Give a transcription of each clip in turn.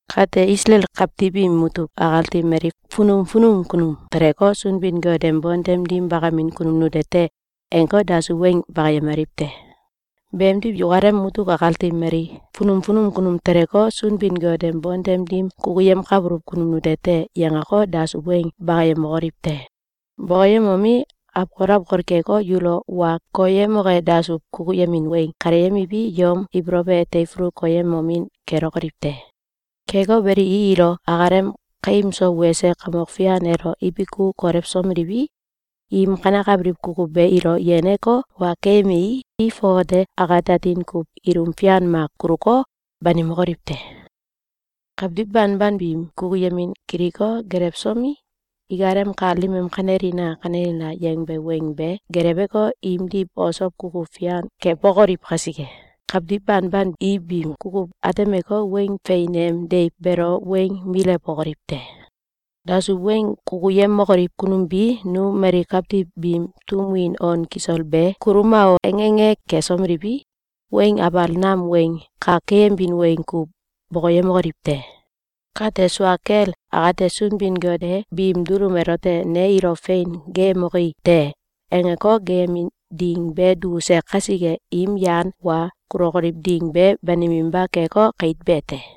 Kate, Isalael kawtiw im mutuk akati mali funum funum kunum teleko, “Sunbin-Got em bontem dim bakamin kunum nute te!”, angeko, dasuw weng bakayemaliw te. Beemdiw, yukalem mutuk akati mali funum funum kunum teleko, “Sunbin-Got em bontem dim kukuyemkabuluw kunum nute te!”, yangeko, dasuw weng bakayemokoliw te. Bokoyemomi, awkol awkol keko, yulo wa koyemoke dasuw kukuyemin weng kaleyemiwi, yom ibolow elo teifulu koyemomin kelokoliw te. Keko beli, i ilo akalem kaim so wese Kamok Fian elo ibiku kolewsomeliwi, im kanekabiliw kukuw be ilo yeneko, wa keyemei, i fongate akate atin kuw ilum fian mak kuluko, banimokoliw te. Kawtiw banban biim kukuyemin kiliko, gelewsomi, ikalem kal dim em “Kanelina! Kanelina!”, yangbe weng be geleweko, imdiw osow kukuw fian keembokoliw kasike, kawtiw banban i biim kukuw atemeko, Weng Fein em Deiw beelo weng milewbokoliw te. Dasuw weng kukuyemokoliw kunum bi “Nu mali kawtiw biim tum win on kisol be kuluma o!”, ange ange kesomeliwi, weng abal nam weng kak keyemin weng kuw bokoyemokoliw te. Kate, sua kel akate, Sunbin-Got e biim dulum elote “Ne ilo fein geeyemoki te!”, angeko, geeyemin ding be dukuse kasike, im yan wa kulokoliw ding be baniminba keko, kait be te.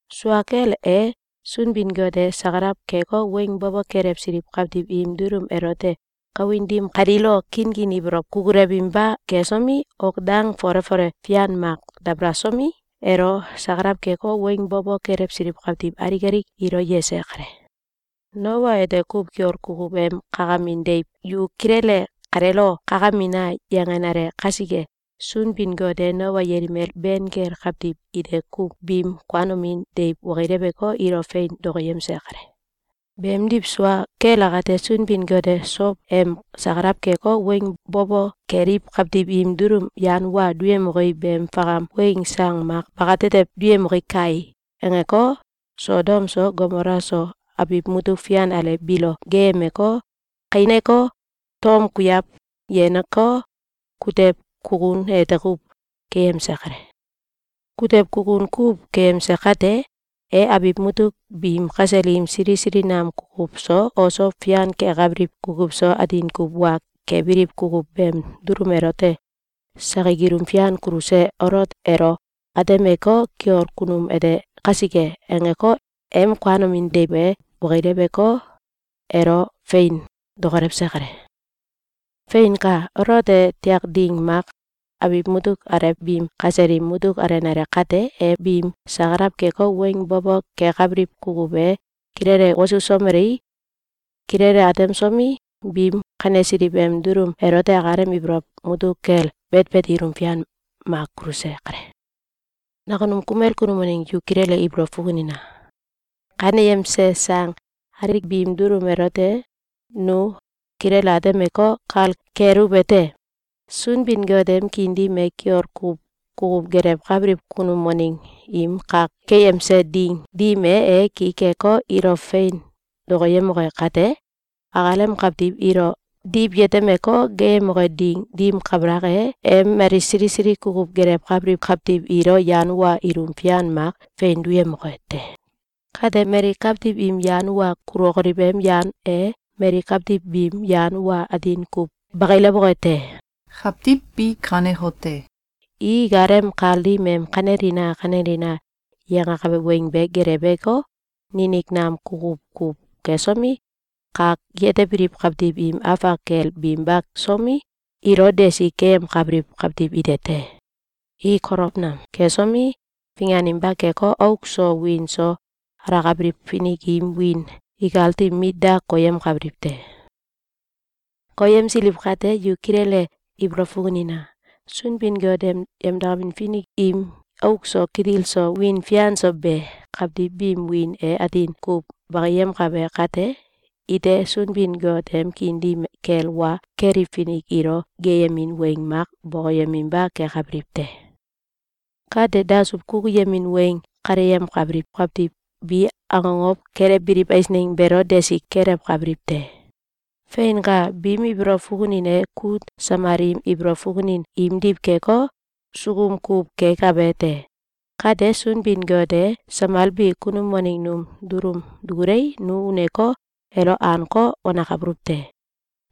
Sua kel e, Sunbin-Got e sakalaw keko, weng bo bo kelewsiliw kawtiw im dulum elote kawin dim kaliilo kinkin ibolow kukulewinba kesomi, ok dang fole fole fian mak dabalasomi, elo sakalaw keko, weng bo bo kelewsiliw kawtiw alik alik ilo yese kale. Noa ete kuw kiol kukuw em kakamin deiw “Yu kilele kaleelo kakamina!”, yangenale kasike, Sunbin-Got e Noa yelimel ben kel kawtiw ite kuw biim kuanomin deiw okileweko, ilo fein dokoyemse kale. Beemdiw, sua kel akate, Sunbin-Got e “Sow em sakalaw keko, weng bo bo keliw kawtiw im dulum yan wa duyemoki beem fakam weng sang mak bakatetew duyemoki kai!”, angeko, Sodom so Gomola so, abiw mutuk fian alew biilo geeyemeko, kaineko, tom kuiaw yeneko, kutew kukun ete kuw keyemse kale. Kutew kukun kuw keyemse kate, e abiw mutuk biim kasel im sili sili nam kukuw so, osow fian kekabiliw kukuw so, atin kuw wa kebiliw kukuw beem dulum elote sakik ilum fian kuluse Olot elo atemeko, “Kiol kunum ete kasike!”, angeko, em kuanomin deiw be okileweko, elo fein dokolewse kale. Feinka! Olot e tiak ding mak abiw mutuk alew biim kasel im mutuk alenale kate, e biim sakalaw keko, weng bo bo kekabiliw kukuw be kilele wosusomelei, kilele atemsomi, biim kanesiliw em dulum elote akalem ibolow mutuk kel betbet ilum fian mak kuluse kale. Nakunum kumel kunum waneng yu kilele ibolow fukunina! Kaneyemse sang alik biim dulum elote nu kilele atemeko, kal keluwete: Sunbin-Got em kiin dim e kiol kuw kukuw gelewkabiliw kunum waneng im kak keyemse ding dim e, e ki keko, ilo fein dokoyemoke kate, akalem kawtiw ilo diwyetemeko, geeyemoke ding dim kabalak e, e mali sili sili kukuw gelewkabiliw kawtiw ilo yan wa ilum fian mak fein duyemoke te. Kate, mali kawtiw im yan wa kulokoliw em yan e mali kawtiw biim yan wa atin kuw bakilewoke te. Kawtiw bi kanekote: I ikalem kal dim em “Kanelina! Kanelina!”, yangakabe weng be geleweko, ninik nam kukuw kuw kesomi, kak yetebiliw kawtiw im afak kel binba somi, ilo desi keyemkabiliw kawtiw ite te. I kolow nam kesomi, finganinba keko, auk so wiin so alakabiliw finik im wiin ikati mit da koyemkabiliw te. Koyemsiliw kate, yu kilele ibolow fukunina! Sunbin-Got em yemdakamin finik im auk so, kitil so, wiin fian so be kawtiw biim wiin e atin kuw bakiyemkabe kate, ite Sunbin-Got em kiin dim kel wa keliw finik ilo geeyemin weng mak bokoyeminba kekabiliw te. Kate, dasuw kukuyemin weng kaleyemkabiliw kawtiw bi akokow kelewbiliw eisneng beelo desi kelewkabiliw te. Feinka! Biim ibolow fukunin e kut samal im ibolow fukunin imdiw keko, sukum kuw kekabe te. Kate, Sunbin-Got e samal be kunum waneng num dulum dukulei, nu uneko, elo anko, wanakabuluw te.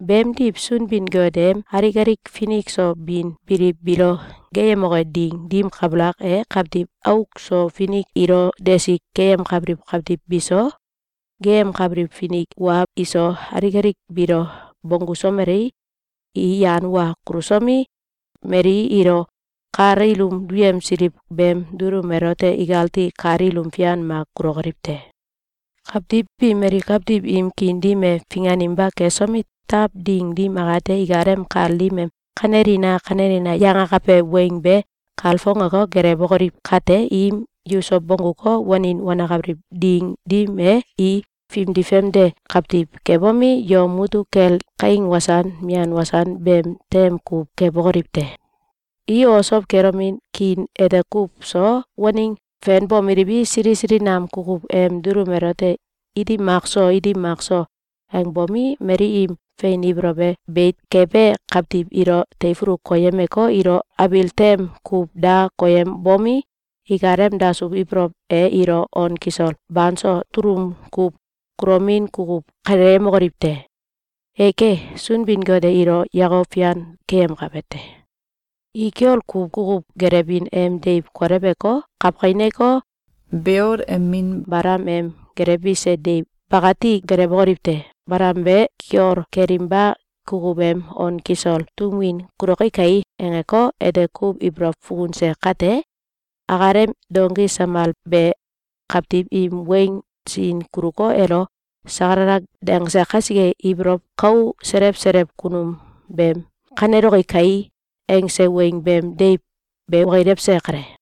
Beemdiw, Sunbin-Got em alik alik finik so bin biliw biilo geeyemoke ding dim kabalak e, kawtiw auk so finik ilo desi keyemkabiliw kawtiw biso, geeyemkabiliw fink wa iso, alik alik biilo bonggusomelei, i yan wa kulusomi, mali ilo kal ilum duyemsiliw beem dulum elote ikati kal ilum fian mak kulokoliw te. Kawtiw bi, mali kawtiw im kiin dim e finganinba kesomi, taw ding dim akate, ikalem kal dim em “Kanelina! Kanelina!”, yangakabe weng be kalfongeko, gelewokoliw kate, im yuso bongguko, wanin wanakabiliw ding dim e, i fimdi famde kawtiw kebomi, yom mutuk kel kaing wasan mian wasan beem tem kuw kebokoliw te. I osow kelomin kiin ete kuw so waneng fenbomeliwi, sili sili nam kukuw em dulum elote “Iti mak so! Iti mak so!”, angbomi, mali im fein ibolow e beit kebe kawtiw ilo teifulu koyemeko, ilo abil tem kuw da koyembomi, ikalem dasuw ibolow e ilo on kisol banso tulun kuw kulomin kukuw kaleyemokoliw te. Eke! Sunbin-Got e ilo yakok fian keyemkabe te! I kiol kuw kukuw gelewbin em deiw koleweko, kawkaineko, Beol em min Balam em gelewbise deiw bakati gelewokoliw te. Balam be kiol kelinba kukuw em “On kisol tum win kuloki kai!”, angeko, ete kuw ibolow fukunse kate, akalem donki samal be kawtiw im weng sin kuluko, elo sakalala dangse kasike, ibolow kou selew selew kunum beem “Kaneloki kai!”, angse weng beem deiw be okilewse kale.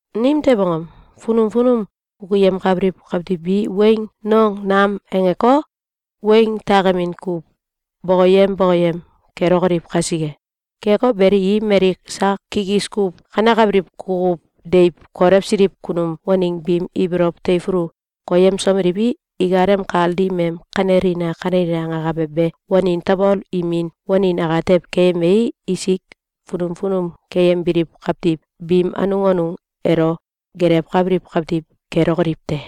Nimtew angom? Funum funum kukuyemkabiliw kawtiw bi weng nong nam angeko, weng takemin kuw bokoyem bokoyem kelokoliw kasike. Keko beli, i mali sak kikis kuw kanekabiliw kukuw deiw kolewsiliw kunum waneng biim ibolow teifulu koyemsomeliwi, ikalem kal dim em “Kanelina! Kanelina!”, angakabe be wanin tabol imin wanin atew keyemei, isik funum funum keyembiliw kawtiw biim anung anung elo gelewkabiliw kawtiw kelokoliw te.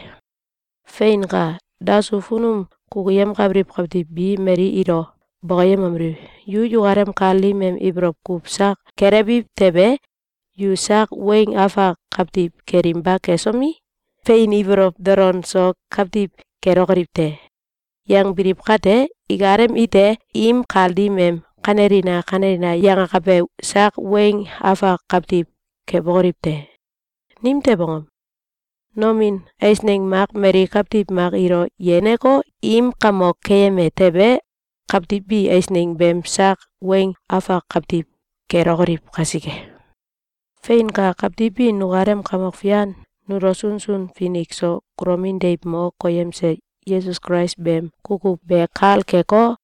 Feinka! Dasuw funum kukuyemkabiliw kawtiw bi mali ilo bokoyemomeliw: “Yu yukalem kal dim em ibolow kuw sak gelewiw tewe, yu sak weng afak kawtiw kelinba kesomi, fein ibolow dolon so kawtiw kelokoliw te!”, yangbiliw kate, ikalem ite im kal dim em “Kanelina! Kanelina!”, yangakabe sak weng afak kawtiw kebokoliw te. Nimtew angom? Nomin eisneng mak mali kawtiw mak ilo yeneko, im kamok keyeme tewe, kawtiw bi eisneng beem sak weng afak kawtiw kelokoliw kasike. Feinka! Kawtiw bi nukalem Kamok Fian nulo sunsun finik so kulomin deiw mo koyemse Yesus Kulais beem kukuw be kal keko,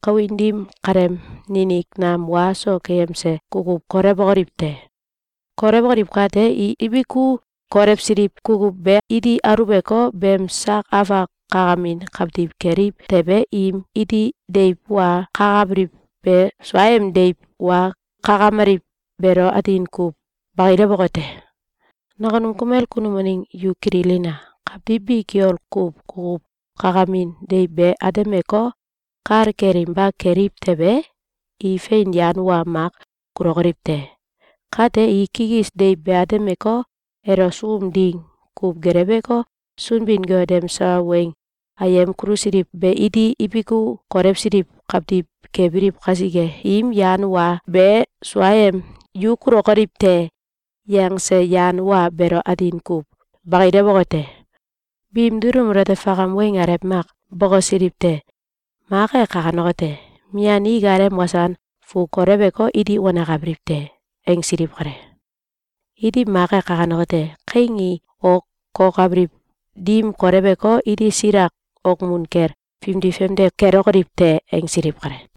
kawin dim kaleem ninik nam wa so keyemse kukuw kolewokoliw te. Kolewokoliw kate, i ibiku kolewsiliw kukuw be iti aluweko, beem sak afak kakamin kawtiw keliw tewe, im iti deiw wa kakabiliw be suaem deiw wa kakameliw beelo atin kuw bakilewoke te. Nakunum kumel kunum waneng yu kililina! Kawtiw bi kiol kuw kukuw kakamin deiw be atemeko, kal kelinba keliw tewe, i fein yan wa mak kulokoliw te. Kate, i kikis deiw be atemeko, elo sukum ding kuw geleweko, Sunbin-Got em sawa weng ayem kulusiliw be iti ibiku kolewsiliw kawtiw kebiliw kasike, im yan wa be suaem “Yu kulokoliw te!”, yangse yan wa beelo atin kuw bakilewoke te. Biim dulum elote fakam weng alew mak bokosiliw te. Mak e kanekote: “Mian i ikalem wasan fu kolewko, iti wanakabiliw te.”, angsiliw kale. Iti mak e kanekote: “Kaing i ok kuokabiliw dim koleweko, iti silak okmun kel fimdi famde kelokoliw te.”, angsiliw kale.